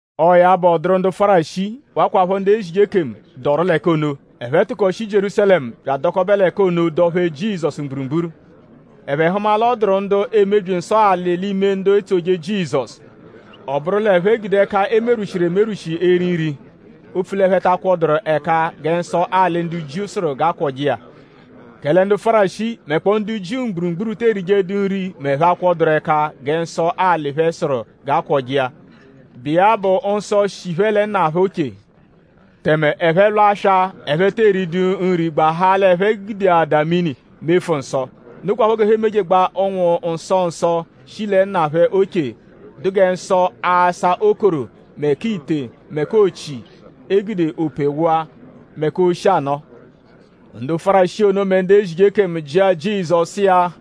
Ọo ya bụ; ọ dụru ndu Fárisii; wakwaphọ ndu ezije ekemu, dọru l'ẹka ono. Ẹphe tụko shi Jierúsalẹmu bya adọkobe l'ẹka ono dọ-phee Jizọsu mgburugburu. Ẹphe hụma l'ọ dụru ndu emebyi nsọ alị l'ime ndu etsoje Jizọsu. Ọ bụru l'ẹphe gude ẹka, e merwushiru emerwụshi eri nri; opfu l'ẹphe ta akwọduru ẹka gẹ nsọ alị ndu Jiu sụru g'a kwọje iya. Kẹle ndu Fárisii; mẹkpoo ndu Jiu mgburugburu te erijedu nri m'ẹphe -akwọduru ẹka gẹ nsọ alị phẹ sụru g'a kwọje iya, bụ iya bụ nsọ, shi phẹ lẹ nna phẹ oche. Tẹme ẹphe -lwa aswa; ẹphe tee ridu nri; gbahaa l'ẹphe gudeadaa mini mefu nsọ. Nokwaphọ g'ẹphe emejegbaa ụnwu nsọ ọzo, shi lẹ nna phẹ oche, dụ gẹ nsọ asa okoro mẹ k'ite mẹ k'ochi, e gude ope wụa; mẹ k'oshi-anọo. Ndu Fárisii ono mẹ ndu ezije ekemu jịa Jizọsu sụ iya: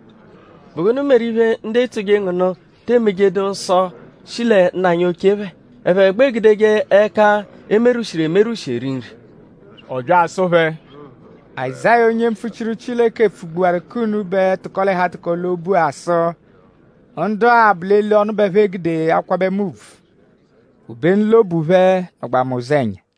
“?Bụ gụnu meru iphe, ndu etsoje ngu nụ te emejedu nsọ, shi lẹ nna anyi oche phẹ; ẹphe gbẹ egudeje ẹka, e merwushiru emerwụshi eri nri?” Ọ bya asụ phẹ: “Azáya onye mpfuchiru Chileke pfugbuwaru k'unubẹ tụko-l'ẹhu-atụko-l'obu-a sụ: “Ndu-a bụ eli ọnu bẹ ẹphe gude akwabẹ mu ùbvù. Obenu l'obu phẹ nọgbaa mu ụzenya.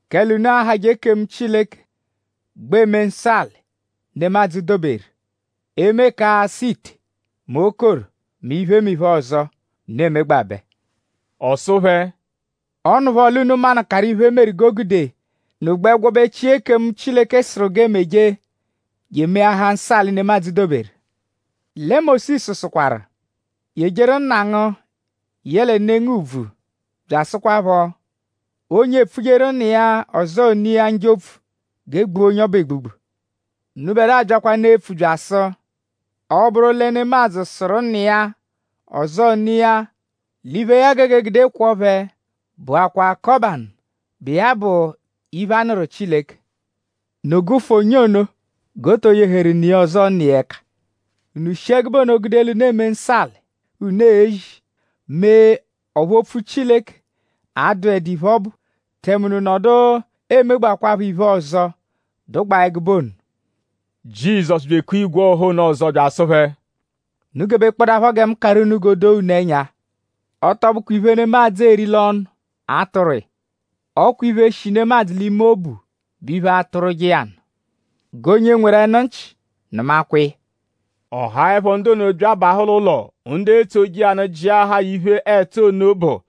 “Kẹle unu ahajẹ ekemu Chileke; gbẹ eme nsọ alị, nemadzụ doberu; eme k'asa ite; mẹ okoro; mẹ iphemiphe ọzo, unu emegbabẹ.” Ọ sụ phẹ: “Ọ nụpho l'unu manụkaru iphe meru g'o gude unu gbẹ gwọbechia ekemu, Chileke sụru g'e meje je emeahaa nsọ alị, nemadzụ doberu. Lẹ Mósisu sụkwaru: ‘Yejeru nna ngu yẹle ne ngu ùbvù’; bya asụkwapho: ‘Onye epfujeru nna iya; ọzoo ne iya njọ opfu g'e gbua onye ọbu egbugbu.’ Unubẹdua byakwanụ epfu bya asụ: Ọ -bụru lẹ nemadzụ sụru nna iya; ọzoo ne iya l'iphe, ya gege egude kwọo phẹ bụakwa ‘kọbanu’, bụ iya bụ ‘iphe, a nụru Chileke.’ Unu gụfu onye ono g'o to yeheru ne iya ọzoo nna iya ẹka. Unu shi ẹgube ono gude l'unu eme nsọ alị, unu ezi; mee ọphu opfu Chileke adụedu iphe, ọ bụ; tẹme unu nọdu emegbakwaphọ iphe ọzo, dụgbaa ẹgube ono.” Jizọsu bya ekua igwe ọha ono ọzo bya asụ phẹ: “Unu gebekpọdapho gẹ mu karụ unu g'o doo unu ẹnya. Ọ tọ bụkwa iphe, nemadzụ eri l'ọnu atụrwu iya; ọ kwa iphe, shi nemadzụ l'ime obu bụ iphe, atụrwuje iya nụ. G'onye nweru ẹnu nchị; nụmakwa iya!” Ọ haẹpho ndu ono bya abahụ l'ụlo; ndu etsoje iya nụ jịahaa ya iphe, ẹtu ono bụ.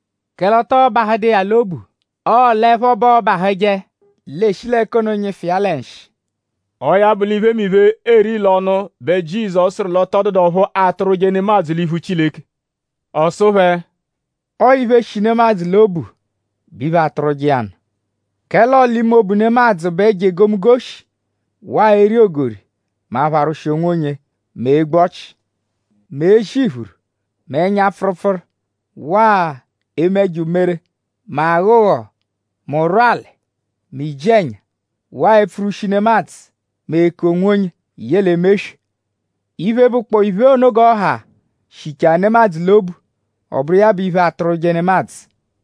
Kẹle ọ tọo bahụdu iya l'obu; ọo l'ẹpho bẹ ọobahuje; l'e shi l'ẹka ono nyịfu iya lẹ nshị.” Ọo ya bụ l'iphemiphe, eeri l'ọnu bẹ Jizọsu sụru l'ọ tọ dụdu ọphu atụrwuje nemadzụ l'iphu Chileke. Ọ sụ phẹ: “Ọo iphe, shi nemadzụ l'obu bụ iphe, atụrwuje iya nụ. Kẹle ọo l'ime obu nemadzụ bẹ ẹjo egomunggo shi; waa eri ogori; mẹ apharwụshi onwonye; mẹ egbu ọchi; mẹ ezi iphuru; mẹ ẹnya-pfụrupfuru; waa eme ẹjo umere; mẹ aghọ ụgho; mẹ ụrwuali; mẹ iji-ẹnya; waa epfurwushi nemadzụ; mẹ eku-onwonye; yẹle eme eswe. Iphe, bụkpoo iphe ono g'ọ ha shichaa nemadzụ l'obu; ọ bụru iya bụ iphe, atụrwuje nemadzụ.”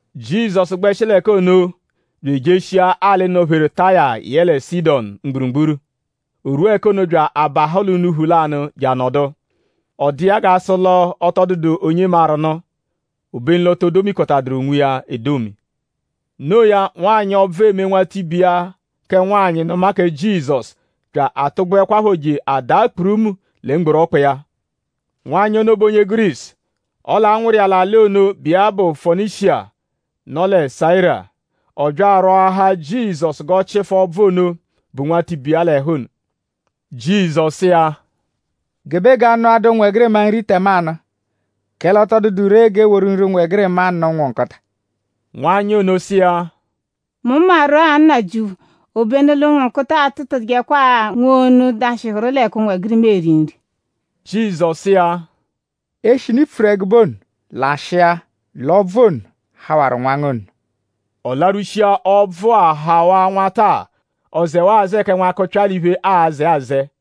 Jizọsu gbẹshi l'ẹka ono bya ejeshia alị, nọ-pheru Taya yẹle Sidọnu mgburugburu. O rwua ẹka ono bya abahụ l'unuphu lanụ je anọdu. Ọ dụ iya g'a sụ l'ọ tọ dụdu onye maru nụ; obenu l'o to domikọtaduru onwiya edomi. Noo ya; nwanyị, ọbvu eme nwatibe iya kẹ nwanyị nụma kẹ Jizọsu bya atụgbuekwapho je adaa kpurumu lẹ mgboru ọkpa iya. Nwanyị ono bụ onye Gurisu; ọle a nwụru iya l'alị ono, bụ iya bụ Fonishiya, nọ lẹ Sayira. Ọ bya arwọahaa Jizọsu g'ọ chịfu ọbvu ono, bu nwatibe iya l'ẹhu ono. Jizọsu sụ iya: “Gebe g'a nụadaa ụnwegirima nri tẹmanu; kẹle ọ tọ dụdu ree g'e woru nri ụnwegirima nụ ụnwu nkụta.” Nwanyị ono sụ iya: “Mu maru-a Nnajịuphu; obenu l'ụnwu nkụta atụtujekwa-a nwonu, dashịhuru l'ẹka ụnwegirima eri nri.” Jizọsu sụ iya: “Eshinu i pfuru ẹgube ono; lashịa l'ọbvu ono hawaru nwa ngu ono!” Ọ larwushia; Ọbvu-a hawaa nwata-a. Ọ zẹwaa azẹe kẹ nwakụpya l'iphe, aazẹ azẹe.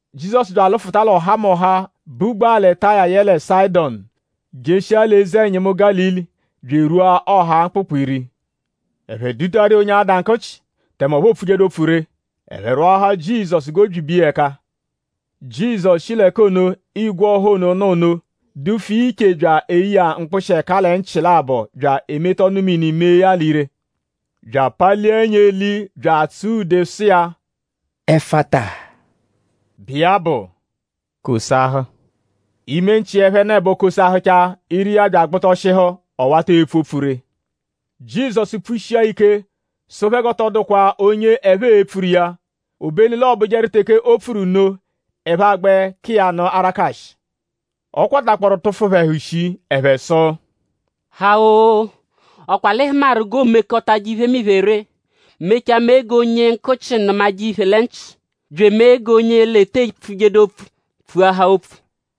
Jizọsu bya alụfuta l'ọhamoha, bugbaa lẹ Taya yẹle Sayịdonu jeshia l'eze-ẹnyimu Gálili; bya erwua ọha Mkpụkpu-Iri. Ẹphe dutaru iya onye ada nkụchi; tẹme ọphu oopfujedu opfu ree. Ẹphe rwọahaa Jizọsu g'o byibe iya ẹka. Jizọsu shi l'ẹka ono, igwe ọha ono nọ ono; dufu iya iche bya eye iya mkpụshi ẹka lẹ nchị labọ bya emeta ọnu-mini mee ya l'ire bya apalia ẹnya l'eli bya atsụa ude sụ iya: “Ẹfata” bụ iya bụ: “kosahụ!” Ime nchị iya ẹphenebo kosahụchaa; ire iya bya agbụtoshihu; ọ wata epfu opfu ree. Jizọsu pfushia ya ike sụ phẹ g'ọ tọ dụkwa onye ẹphe e-pfuru iya; obenu l'ọobujeru teke o pfuru nno; ẹphe agbẹ ka iya nụ arakashị. Ọ kwatakpọro tụfu phẹ ẹhu shii; ẹphe sụ: “Ha-o!?Ọ kwa l'ị hụmaru g'oomekọtaje iphemiphe ree; mechaa mee g'onye nkụchi nụmaje iphe lẹ nchị; bya emee g'onye l'ete pfujedu opfu pfuahaa opfu.”